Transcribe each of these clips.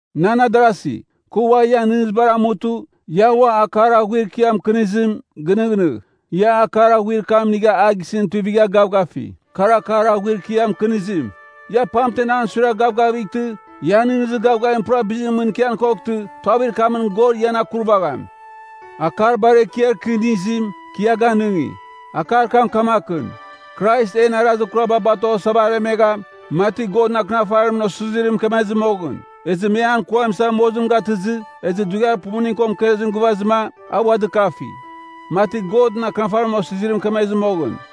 Nan adarasi, kɨ ua ian nɨghnɨzibar amutɨ, ia ua akar aghuir kɨ ia mɨkɨnizim, ginɨghnɨgh. Ia akar aghuir kam inigha a gisɨn tuivigha gavgafi. Kar akar aghuir kɨ ia mɨkɨnizim. Ia pamtemɨn an suiragh gavgavightɨ, ian nɨghnɨzir gavgavim pura bizim mɨn ikian koghtɨ, tuavir kamɨn God ian akurvagham. Akar bar ekiar kɨ inizim, kɨ ia ganɨngi. Akar kam kamakɨn: Krais en arazir kuraba batoghasava aremegha, mati Godɨn Akɨnafarimɨn osizirim mɨkemezɨ moghɨn. Ezɨ me an kuam isa mozim gatɨzɨ, ezɨ dughiar pumuning ko mɨkezim gɨvazɨma, a ua dɨkafi, mati Godɨn Akɨnafarimɨn osizirim mɨkemezɨ moghɨn.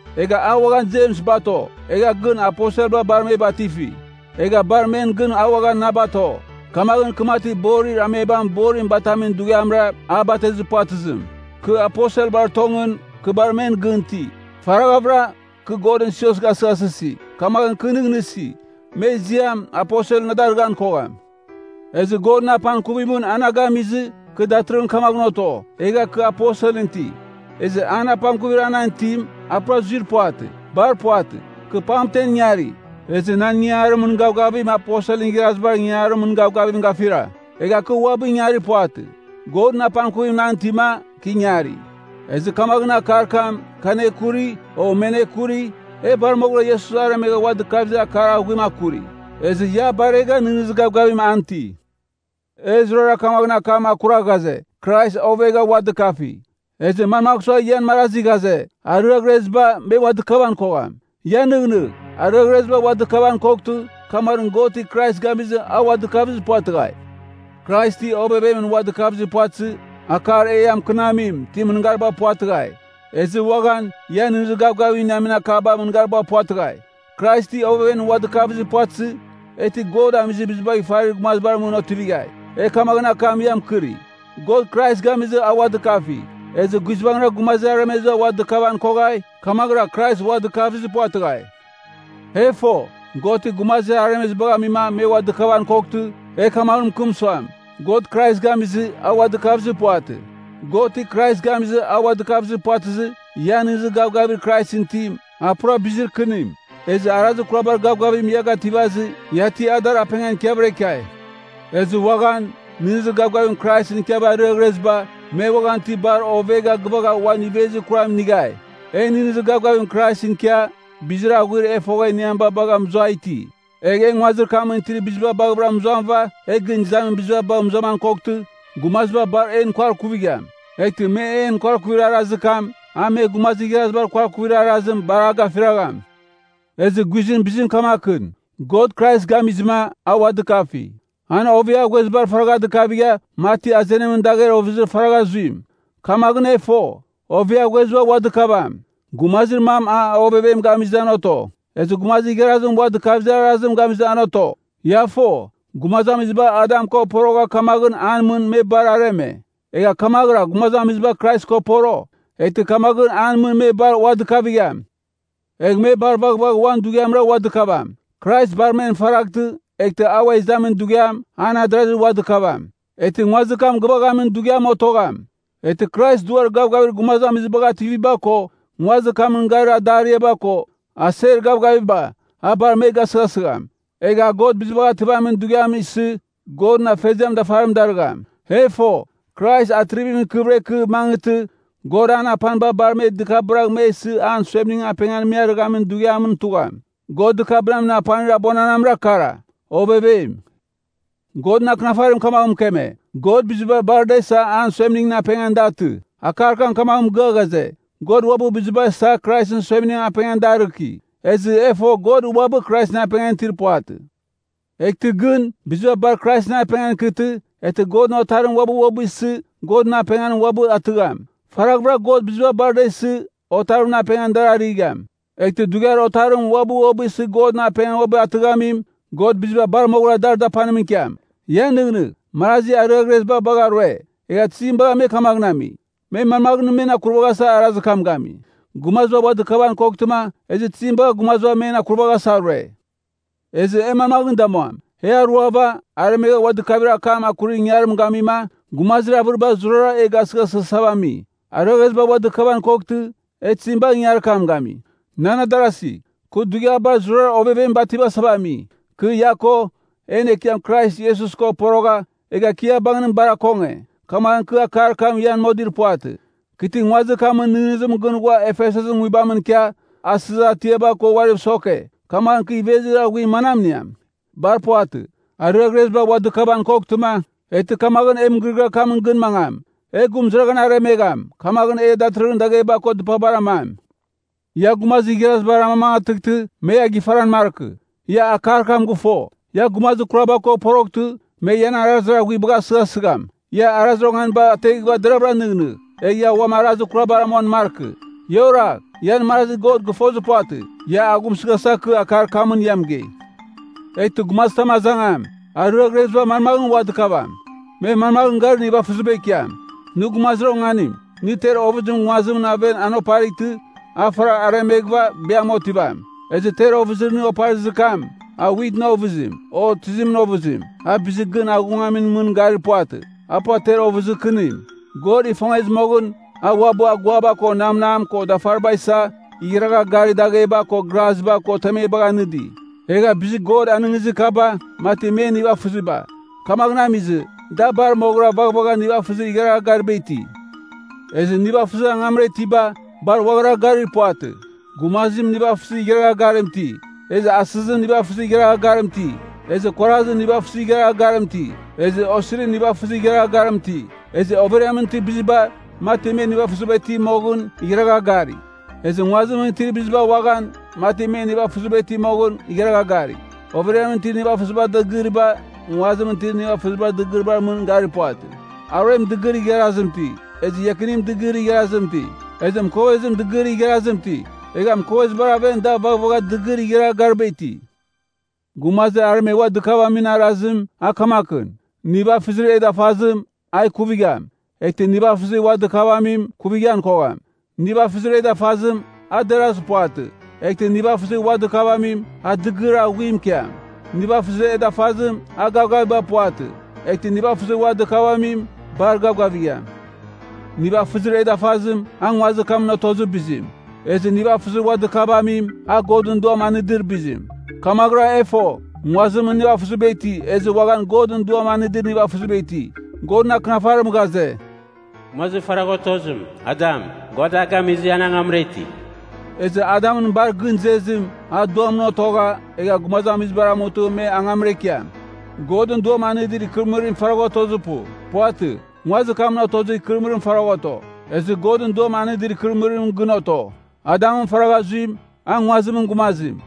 Egha a uaghan Jems bato, egha gɨn aposelba bar me batifi. Egha bar men gɨn a uaghan na bato. Kamaghɨn kɨ mati borir amebam borim batamin dughiamra, a batezir puvatɨzim. Kɨ aposelbar tongɨn, kɨ bar men gɨn iti. Faraghavɨra, kɨ Godɨn sios gasɨghasɨsi, kamaghɨn kɨ nɨghnɨsi, me ziam “aposel” na darɨghan kogham. Ezɨ Godɨn apangkuvimɨn a na gamizɨ, kɨ datɨrɨghɨn kamaghɨn oto, egha kɨ aposelɨn iti. Ezɨ an apangkuvir a nan itim, a pura zuir puvatɨ. Bar puvatɨ, kɨ pamtem ingari, ezɨ nan ingaramin gavgavim aposelɨn igharazibar ingaramin gavgavim gafira. Egha kɨ uabɨ ingari puvatɨ, Godɨn apangkuvim nan itima, kɨ ingari. Ezɨ kamaghɨn akar kam, kɨ anekuri, o me anekuri, e bar moghɨra Iesus aremegha ua dɨkavizir akar aghuim akuri. Ezɨ ia a baregha nɨghnɨzir gavgavim an iti. E zurara kamaghɨn akam akura ghaze, Krais ovegha ua dɨkafi. Ezɨ manmagh sua ian marazi ghaze, “Ariaghreziba, me ua dɨkavan kogham”? Ia nɨghnɨgh. Ariaghreziba ua dɨkavan koghtɨ, kamaghɨn God ti Krais gamizɨ a ua dɨkavizir puvatɨghai. Krais ti ovevemɨn ua dɨkavizir puvatɨzɨ, akar e ia mɨkɨnamim, ti mɨngariba puvatɨghai. Ezɨ uaghan, ia nɨghnɨzir gavgavim iniamin akaba mɨngariba puvatɨghai. Krais ti ovevemɨn ua dɨkavizir puvatɨzɨ, e ti God amizir bizibagh ifarir gumazibar mɨn otivighai. E kamaghɨn akam ia mɨkɨri, God Krais gamizɨ a ua dɨkafi. Ezɨ guizbangɨra gumazir aremeziba ua dɨkavan koghai, kamaghɨra Krais ua dɨkavizir puvatɨghai. E fo, God ti gumazir aremezibagh amima me ua dɨkavan koghtɨ, e kamaghɨn mɨkɨm suam, “God Krais gamizɨ, a ua dɨkavizir puvatɨ.” God ti Krais gamizɨ a ua dɨkavizir puvatɨzɨ, ian nɨghnɨzir gavgavir Kraisɨn itim, a pura bizir kɨnim. Ezɨ arazir kurabar gavgavim ia gativazɨ, ia ti adar apengan ikiavɨra ikiai. Ezɨ uaghan, nɨghnɨzir gavgavim Kraisɨn ikiava ariaghreziba, me uaghan ti bar ovegha gɨvagha uan ivezir kuram inighai. E nɨghnɨzir gavgavim Kraisɨn ikia, bizir aghuir e fogha iniamiba bagha mɨzuai iti. Egh, e nguazir kamɨn itir biziba baghɨvɨra mɨzuamɨva, egh gɨn izamin biziba bagh mɨzuaman koghtɨ, gumaziba bar en kuarkuvigham. Eghtɨ me en kuarkuvir arazir kam, a me gumazir igharazibar kuarkuvir arazim, bar a gafiragham. Ezɨ guizɨn bizim kamakɨn: God Krais gamizɨma, a ua dɨkafi. An oveaghuezibar faragha dɨkavigha, mati azenimɨn dagher ovɨzir faragha zuim. Kamaghɨn e fo, oveaghueziba ua dɨkavam. Gumazir mam a ovevem gamizɨ, an oto. Ezɨ gumazir igharazim ua dɨkavir arazim gamizɨ, an oto. Ia fo, gumazamiziba Adam ko porogha kamaghɨn an mɨn me bar areme, egha kamaghɨra gumazamiziba Krais ko poro, eghtɨ kamaghɨn an mɨn me bar ua dɨkavigham. Egh me bar vaghvagh uan dughiamra ua dɨkavam. Krais bar men faraghtɨ, eghtɨ a ua izamin dughiam, an adarazi ua dɨkavam. Eghtɨ nguazir kam gɨvaghamin dughiam otogham. Eghtɨ Krais duar gavgavir gumazamizibagh ativiba ko, nguazir kamɨn garir adariaba ko, aser gavgaviba, a bar me gasɨghasigham. Egh a God Bizibagh Ativamin Dughiam isɨ, God Afeziamɨn dafarim darɨgham. E fo, Krais atrivimɨn ikɨvɨra ikɨ, mangɨtɨ, God an apaniba bar me dɨkabɨragh me isɨ an suemningɨn apengan me arɨghamin dughiamɨn tugham. God dɨkabɨnamin apanir abuananamra kara: ovevem. Godɨn Akɨnafarim kamaghɨn mɨkeme, “God biziba bar da isa an suemningɨn apengan da atɨ.” Akar kam kamaghɨn mɨgɨa ghaze, God uabɨ biziba isa Kraisɨn suemningɨn apengan da arɨki. Ezɨ e fo God uabɨ Kraisɨn apengan itir puvatɨ. Eghtɨ gɨn, biziba bar Kraisɨn apengan ikɨtɨ, eghtɨ Godɨn Otarim uabɨ uabɨ isɨ, Godɨn apengan uabɨ atɨgham. Faraghvɨra God biziba bar da isɨ, Otarimɨn apengan dar arɨgham. Eghtɨ dughiar Otarim uabɨ uabɨ isɨ Godɨn apengan uabɨ atɨghamim, God biziba bar moghɨra dar dapanimɨn ikiam. Ia nɨghnɨgh, marazi ariaghreziba bagha rue, egha tizim bagha me kamaghɨn ami? Me manmaghɨn men akuvaghasa arazir kam gami? Gumaziba ua dɨkavan koghtɨma, ezɨ tizim bagha gumaziba men akurvaghasa rue? Ezɨ e manmaghɨn damuam? E aruava, aremegha ua dɨkavir akam akurir ingangarim gamima, gumazir avɨriba zurara e gasɨghasɨghasava ami. Ariaghreziba ua dɨkavan koghtɨ, e tizim bagha ingangarir kam gami? Nan adarasi, kɨ dughiabar zurara ovevem bativasava ami. Kɨ ia ko, en Ekiam Krais Iesus ko porogha, egha kɨ ia bangɨn bar akonge, kamaghɨn kɨ akar kam ian modir puvatɨ. Kɨ ti nguazir kamɨn nɨghnɨzimɨn gɨn ghua Efesusɨn nguibamɨn ikia, “asizir atiaba” ko uariv soke, kamaghɨn kɨ ivezir aghuir manam iniam? Bar puvatɨ. Ariaghreziba ua dɨkavan koghtɨma, eghtɨ kamaghɨn e mɨgɨrɨgɨar kamɨn gɨn mangam, “E gurumɨzaraghan aremegham, kamaghɨn e datɨrɨghɨn dagheba ko dɨpabar amam.” Ia gumazir igharazibar amamangatɨghtɨ, me ia gifaran markɨ. Ia akar kam gɨfo, “Ia gumazir kuraba ko poroghtɨ, me ian arazir aghuibagh asɨghasɨgham.” Ia arazir onganiba ateghɨva deravɨra nɨghnɨgh. Egha ia uam arazir kurabar amuan markɨ. Ia oragh, ian marazi God gɨfozir puvatɨ. Ia aghumsɨghasa kɨ akar kamɨn ia mɨgei. Eghtɨ gumazitam azangam, “Ariaghreziba manmaghɨn ua dɨkavigham? Me manmaghɨn garir nivafɨziba ikiam?” Nɨ gumazir onganim! Nɨ ter ovɨzim nguazimɨn aven an oparightɨ, a faragh aremeghɨva, biam otivam. Ezɨ ter ovɨzir nɨ oparizir kam, a witɨn ovɨzim, o tizimɨn ovɨzim, a bizir gɨn aghungamimɨn mɨn garir puvatɨ, a pura ter ovɨzir kɨnim. God ifongezɨ moghɨn, a uabɨ aguaba ko namnam ko dafariba isa, igharagha garir dagheba ko graziba ko temebagh anɨdi. Egha bizir God anɨngizir kaba, mati men nivafɨziba. Kamaghɨn amizɨ, da bar moghɨra vaghvagha nivafɨzir igharagha gariba iti. Ezɨ nivafɨzir angamra itiba, bar uaghara garir puvatɨ. Gumazim nivafɨzir igharagha garim iti. Ezɨ asɨzim nivafɨzir igharagha garim iti, ezɨ kuarazim nivafɨzir igharagha garim iti, ezɨ osirim nivafɨzir igharagha garim iti. Ezɨ overiamɨn itir biziba, mati me nivafɨziba iti moghɨn, igharagha gari. Ezɨ nguazimɨn itir biziba uaghan, mati me nivafɨziba iti moghɨn, igharagha gari. Overiamɨn itir nivafɨzibar dɨgɨriba, nguazimɨn itir nivafɨzibar dɨgɨriba mɨn garir puvatɨ. Aruem dɨgɨrir igharazim iti, ezɨ iakinim dɨgɨrir igharazim iti, ezɨ mɨkovezim dɨgɨrir igharazim iti, egha mɨkovezibar aven da vaghvagha dɨgɨrir igharagha gariba iti. Gumazir aremegh ua dɨkavamin arazim, a kamakɨn. Nivafɨzir e dafazim, a ikuvigham, eghtɨ nivafɨzir ua dɨkavamim, ikuvighan kogham. Nivafɨzir e dafazim, a derazir puvatɨ, eghtɨ nivafɨzir ua dɨkavamim, a dɨgɨrir aghuim ikiam. Nivafɨzir e dafazim, a gavgaviba puvatɨ, eghtɨ nivafɨzir ua dɨkavamim, bar gavgavigham. Nivafɨzir e dafazim, a nguazir kamɨn otozir bizim. Ezɨ nivafɨzir ua dɨkavamim, a Godɨn Duam anɨdir bizim. Kamaghɨra e fo, nguazimɨn nivafɨziba iti, ezɨ uaghan Godɨn Duam anɨdir nivafɨziba iti. Godɨn Akɨnafarim ghaze, “Gumazir faragha otozim, Adam, God a gamizɨ an angamra iti.” Ezɨ Adamɨn bar gɨn izezim, a Duamɨn otogha, egh gumazamizibar amutɨ me angamra ikiam. Godɨn Duam anɨdir ikɨrɨmɨrim faragha otozir pu. Puvatɨ, nguazir kamɨn otozir ikɨrɨmɨrim faragha oto, ezɨ Godɨn Duam anɨdir ikɨrɨmɨrim gɨn oto. Adamɨn faragha zuim, a nguazimɨn gumazim.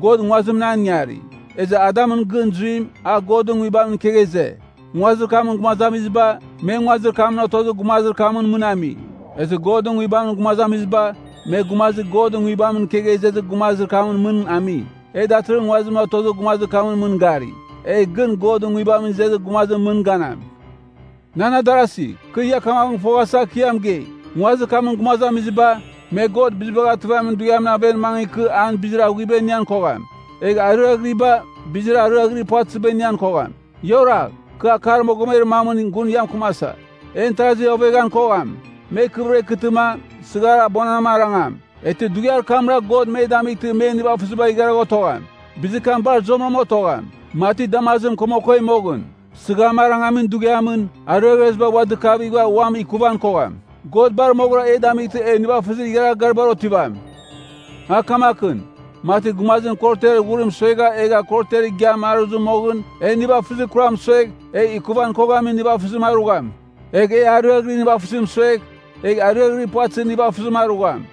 God nguazimɨn an ingari. Ezɨ Adamɨn gɨn zuim, a Godɨn Nguibamɨn ikegha ize. Nguazir kamɨn gumazamiziba, me nguazir kamɨn otozir gumazir kamɨn mɨn ami. Ezɨ Godɨn Nguibamɨn gumazamiziba, me gumazir Godɨn Nguibamɨn ikegha izezir gumazir kamɨn mɨn ami. E datɨrɨghɨn nguazimɨn otozir gumazir kamɨn mɨn gari, egh gɨn Godɨn Nguibamɨn izezir gumazimɨn mɨn ganam. Nan adarasi, kɨ ia kamaghɨn foghasa kɨ ia mɨgei. Nguazir kamɨn gumazamiziba, me God Bizibagh Ativamin Dughiamɨn aven mangɨ ikɨ an bizir aghuiba inian kogham. Egh ariaghiriba, bizir ariaghirir puvatɨziba inian kogham. Ia oragh. Kɨ akar mogomer mamɨn gun ia mɨkɨmasa. En tarazi oveghan kogham. Me ikɨvɨra ikɨtɨma, sɨghar abuananam arangam, eghtɨ dughiar kamra God me damightɨ men nivafɨziba igharagh otogham. Bizir kam bar zuamɨram otogham, mati damazim komokoi moghɨn. Sɨgham arangamin dughiamɨn, ariaghreziba ua dɨkavighɨva uam ikuvan kogham. God bar moghɨra e damightɨ e nivafɨzir igharagha garibar otivam. A kamakɨn, mati gumazim korotiar ghurim suegha egha korotiar igiam aruzɨ moghɨn, e nivafɨzir kuram suegh, egh ikuvighan koghamin nivafɨzim arugham. Egh e ariaghɨrir nivafɨzim suegh, egh ariaghɨrir puvatɨzir nivafɨzim arugham.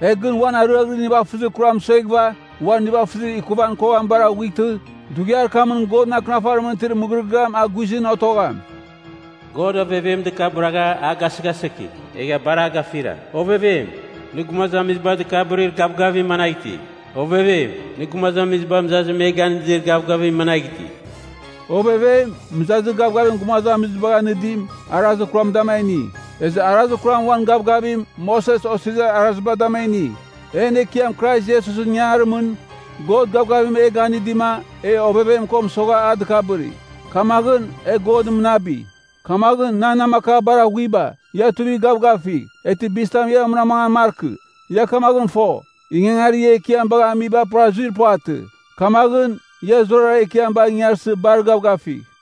E gɨn uan ariaghɨrir nivafɨzir kuram sueghɨva, uan nivafɨzir ikuvan koghamibar aghuightɨ, dughiar kamɨn Godɨn Akɨnafarimɨn itir mɨgɨrɨgɨam a guizɨn otogham, “God ovevem dɨkabɨragha, a gasɨghasɨki, egha bar a gafira. Ovevem, nɨ gumazamiziba dɨkabɨrir gavgavim managh iti? Ovevem, nɨ gumazamiziba mɨzazim me ganɨdir gavgavim managh iti?” Ovevem, mɨzazir gavgavir gumazamizibagh anɨdim, arazir kuram dama a ini. Ezɨ arazir kuram uan gavgavim, Moses Osirizir Araziba dama a ini. En Ekiam Krais Iesusɨn ingangarimɨn, God gavgavim e ganɨdima, e ovevem ko mɨsogha a dɨkabɨri. Kamaghɨn, e Godɨn mɨnabi! Kamaghɨn, nan namakar bar aghuiba, ia tuivigh gavgavigh, eghtɨ bizitam ia munamangan markɨ. Ia kamaghɨn fo, ingangarir ia Ekiam bagha amiba pura zuir puvatɨ. Kamaghɨn, ia zurara Ekiam bagh ingarsɨ bar gavgavigh.